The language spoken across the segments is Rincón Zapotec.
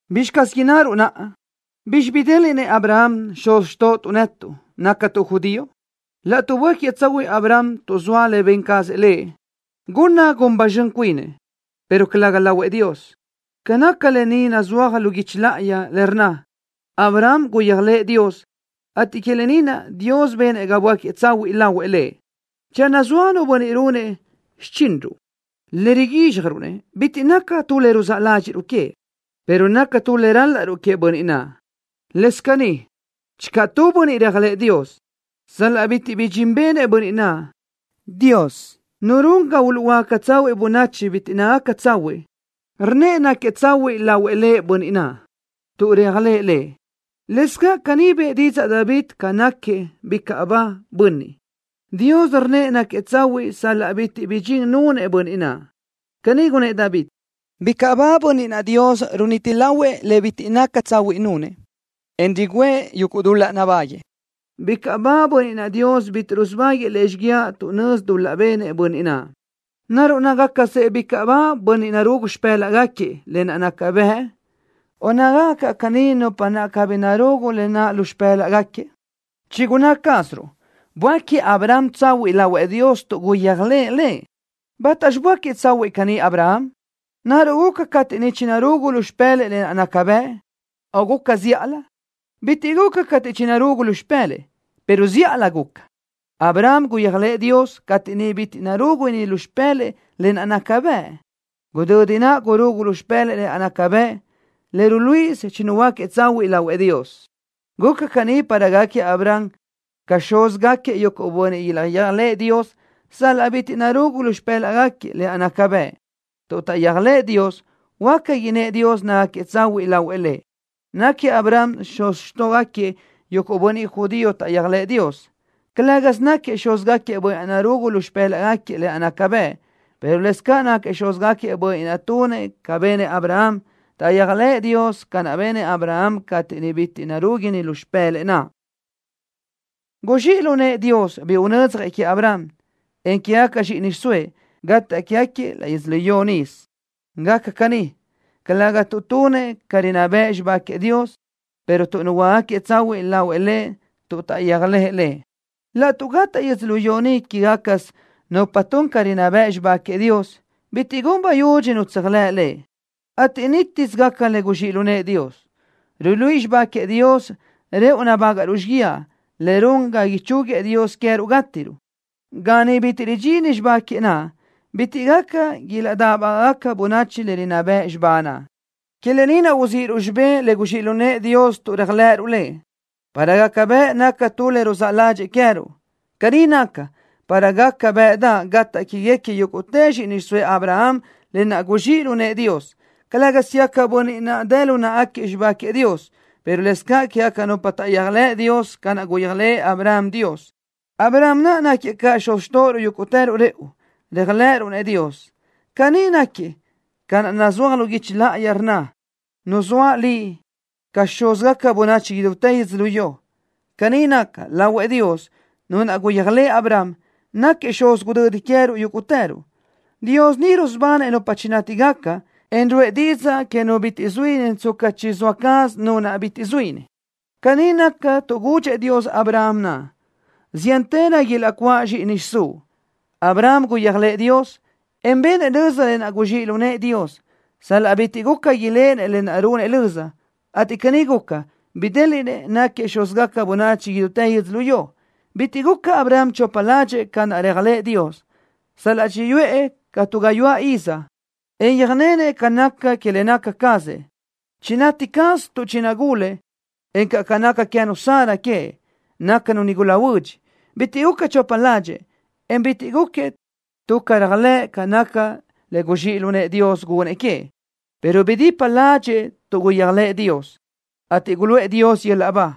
¿Bizxi caz innaruʼ naʼa? ¿Bizxi bidéliʼnëʼ Abraham, xuz xtóʼotuʼ netuʼ, nácatuʼ judío? Laʼtuʼ böáquiëʼ tsahuiʼ Abraham tuʼ zoa le ben cazëʼ lëʼ, gunna gun ba zxön cuinëʼ, pero calëga lahuëʼ Dios. Ca naca lë ni nazúaj lu guichi láʼayi, le rnna: “Abraham guyéajlëʼë Dios, ateʼ que lë ni naʼ Dios benëʼ ga böáquiëʼ tsahuiʼ lahuëʼ Lëʼ.” Channö zoa nu bönniʼ runëʼ xichinruʼ, le riguízxjaruʼ-nëʼ bitiʼ naca tu le ruzáʼ ládxiʼruʼ queëʼ, pero naca tu le ral-laʼruʼ queëʼ bönniʼ naʼ. Lëscaʼ caní channö tu bönniʼ réajlëʼë Dios, sal-laʼ bitiʼ bi dxin benëʼ bönniʼ naʼ, Dios, Nu run ga uluʼhuöáca tsahuiʼ bönachi bitiʼ nácagaca tsahuiʼ, rnnëʼ náquiëʼ tsahuiʼ lahuëʼ Lëʼ bönniʼ naʼ, tuʼ réajlëʼë Lëʼ. Lëscaʼ caní bëʼë didzaʼ David ca náquiëʼ bicaʼ ba bönniʼ, Dios rnnëʼ náquiëʼ tsahuiʼ sal-laʼ bitiʼ bi dxin nunëʼ bönniʼ naʼ. Caní gunnë́ʼ David: ¡Bicaʼ ba bönniʼ naʼ Dios runiti lahuëʼ le bitiʼ naca tsahuiʼ nunëʼ, en rugǘëʼ yuguʼ dul-laʼ nabáguëʼë! ¡Bicaʼ ba bönniʼ naʼ, Dios bitiʼ rusubáguëʼë lëʼ xíguiaʼ tuʼ nözi dul-laʼ benëʼ bönniʼ naʼ! ¿Naruʼ nácagacsëʼ bicaʼ ba bönniʼ narugu lu xipë́laʼgaquiëʼ lë naʼ naca bëʼ, o nácagaca caʼ caní nupa naʼ cabí narugu lë naʼ lu xipë́laʼgaquiëʼ? Chigunná cázaruʼ böáquiëʼ Abraham tsahuiʼ lahuëʼ Dios tuʼ guyéajlëʼë Lëʼ. ¿Bátaxi böáquiëʼ tsahuiʼ caní Abraham? ¿Naruʼ guca cateʼ niʼ chinarugu lu xipë́lëʼë lë naʼ naca bëʼ, o guca zíʼalö? Bitiʼ guca cateʼ chinarugu lu xipë́lëʼë, pero zíʼalö guca. Abraham guyéajlëʼë Dios cateʼ niʼ bitiʼ narúguni lu xipë́lëʼë lë naʼ naca bëʼ. Gudödi naʼ gurugu lu xipë́lëʼë lë naʼ naca bëʼ, le ruluíʼisö chinuhuöáquiëʼ tsahuiʼ lahuëʼ Dios. Guca caní para gáquiëʼ Abraham ca xúzgaquiëʼ yuguʼ bönniʼ ilaʼyéajlëʼë Dios sal-laʼ bitiʼ narugu lu xipë́laʼgaquiëʼ lë naʼ naca bëʼ. Tuʼ taʼyéajlëʼë Dios, huáca innë́ʼ Dios nácagaquiëʼ tsahuiʼ lahuëʼ Lëʼ. Náquiëʼ Abraham xuz xtóʼogaquiëʼ yuguʼ bönniʼ judío taʼyéajlëʼë Dios. Calë́gasö náquiëʼ xúzgaquiëʼ bönniʼ naʼ narugu lu xipë́laʼgaquiëʼ lë naʼ naca bëʼ, pero lëscaʼ náquiëʼ xúzgaquiëʼ bönniʼ naʼ tunëʼ ca benëʼ Abraham, taʼyéajlëʼë Dios ca naʼ benëʼ Abraham cateʼ niʼ bitiʼ narúguni lu xipë́lëʼë lë naʼ. Guzxíʼ lu nëʼë Dios bi unödzjëʼ queëʼ Abraham, en quégaca zxíʼini xiʼsóëʼ, gataʼ quégaquiëʼ laʼ yödzölió nisö. Gaca caní, calëga tuʼ tunëʼ ca rinná bëʼ xibá queëʼ Dios, pero tuʼ nuhuöácagaquiëʼ tsahuiʼ lahuëʼ Lëʼ tuʼ taʼyéajlëʼë Lëʼ. Laʼtuʼ gataʼ yödzölió ni quégacasö nupa tun ca rinná bëʼ xibá queëʼ Dios, bitiʼ gun bayudxi nu tséajlëʼ Lëʼ, ateʼ nítisö gaca le guzxíʼ lu nëʼë Dios. Ruluíʼi xibá queëʼ Dios rëʼu nabágaʼruʼ xíguiaʼ, le run ga ichúguiëʼ Dios queë́ruʼ gátiruʼ. Ga niʼ bitiʼ ridxini xibá queëʼ naʼ, bitiʼ gaca ilaʼdáʼbagaʼ bönachi le rinná bëʼ xibá naʼ. Que lë ni naʼ uzíʼiruʼ xibé le guzxíʼ lu nëʼë Dios tuʼ réajlëʼëruʼ Lëʼ, para gaca bëʼ naca tu le ruzáʼ ládxëʼë queë́ruʼ. Caní naca, para gaca bëʼdaʼ gataʼ quéguequi yúguʼtë zxíʼini xiʼsóëʼ Abraham lë naʼ guzxíʼ lu nëʼë Dios, calë́gasö quégaquiëʼ bönniʼ naʼ dë lu náʼagaquiëʼ xibá queëʼ Dios, pero lëscaʼ quégaca nupa taʼyéajlëʼ Dios ca naʼ guyéajlëʼë Abraham Dios. Abraham naʼ náquiëʼ ca xuz xtóʼoruʼ yúguʼtëruʼ rëʼu, réajlëʼëruʼ-nëʼ Dios. Caní náquiëʼ ca naʼ nazúaj lu guichi láʼayi, le rnna: “Nuzóaʼ liʼ ca xúzgaca bönachi idútë yödzölió.” Caní naca, lahuëʼ Dios, Nu naʼ guyéajlëʼë Abraham, náquiëʼ xuz gudödi queë́ruʼ yúguʼtëruʼ. Dios ni rusubanëʼ nupa chinátigaca, en ruʼë didzaʼ que nu bitiʼ zuíni tsca chizóa caz nu naʼ bitiʼ zuíni. Caní naca tuʼ gudxëʼ Dios Abraham naʼ: “Ziántërö ilaʼcuáʼ zxíʼini xiʼsúʼ.” Abraham guyéajlëʼë Dios, en benëʼ löza lë naʼ guzxíʼ lu nëʼë Dios, sal-laʼ bitiʼ guca iléʼenëʼ lë naʼ runëʼ löza, ateʼ caní guca, bidéliʼnëʼ náquiëʼ xúzgaca bönachi idútë yödzölió. Bitiʼ guca Abraham chopa ládxëʼë ca naʼ réajlëʼë Dios, sal-laʼ chiyuʼë ca tu gayuáʼ iz, en yöjnenëʼ ca naca que le naca cazëʼ, chinati caz tuʼ chinagúladëʼë, encaʼ ca naca queë́nu Sara queëʼ, nácanu nigula huödx. Bitiʼ guca chopa ládxëʼë, en bitiʼ gúquiëʼ tuʼ caréajlëʼ ca naca le guzxíʼ lu nëʼë Dios gunëʼ queëʼ, pero bidipa ládxëʼë tuʼ guyéajlëʼë Dios, ateʼ guluʼë Dios yöl-laʼ ba.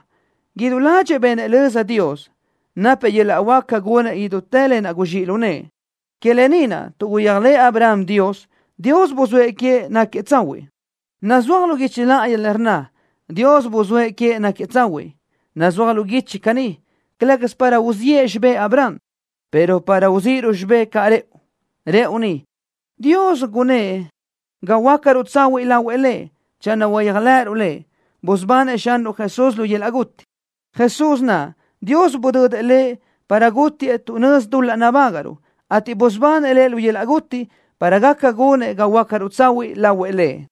Idú ládxëʼë benëʼ löza Dios, napëʼ yöl-laʼ huáca gunëʼ idútë lë naʼ guzxíʼ lu nëʼë. Que lë ni naʼ, tuʼ guyéajlëʼë Abraham Dios, Dios buzóëʼ queëʼ náquiëʼ tsahuiʼ. Nazúaj lu guichi láʼayi le rnna: “Dios buzóëʼ queëʼ náquiëʼ tsahuiʼ.” Nazúaj lu guichi caní, calë́gasö para uziʼë xibé Abraham, pero para uzíʼiruʼ xibé caʼ rëʼu. Rëʼu ni, Dios gunëʼ ga huöácaruʼ tsahuiʼ lahuëʼ Lëʼ channö uyéajlëʼëruʼ Lëʼ, busubanëʼ Xanruʼ Jesús lu yöl-laʼ guti. Jesús naʼ, Dios budödëʼ Lëʼ para gútiëʼ tuʼ nözi dul-laʼ nabágaʼruʼ, ateʼ busubanëʼ Lëʼ lu yöl-laʼ guti, para gaca gunëʼ ga huöácaruʼ tsahuiʼ lahuëʼ Lëʼ.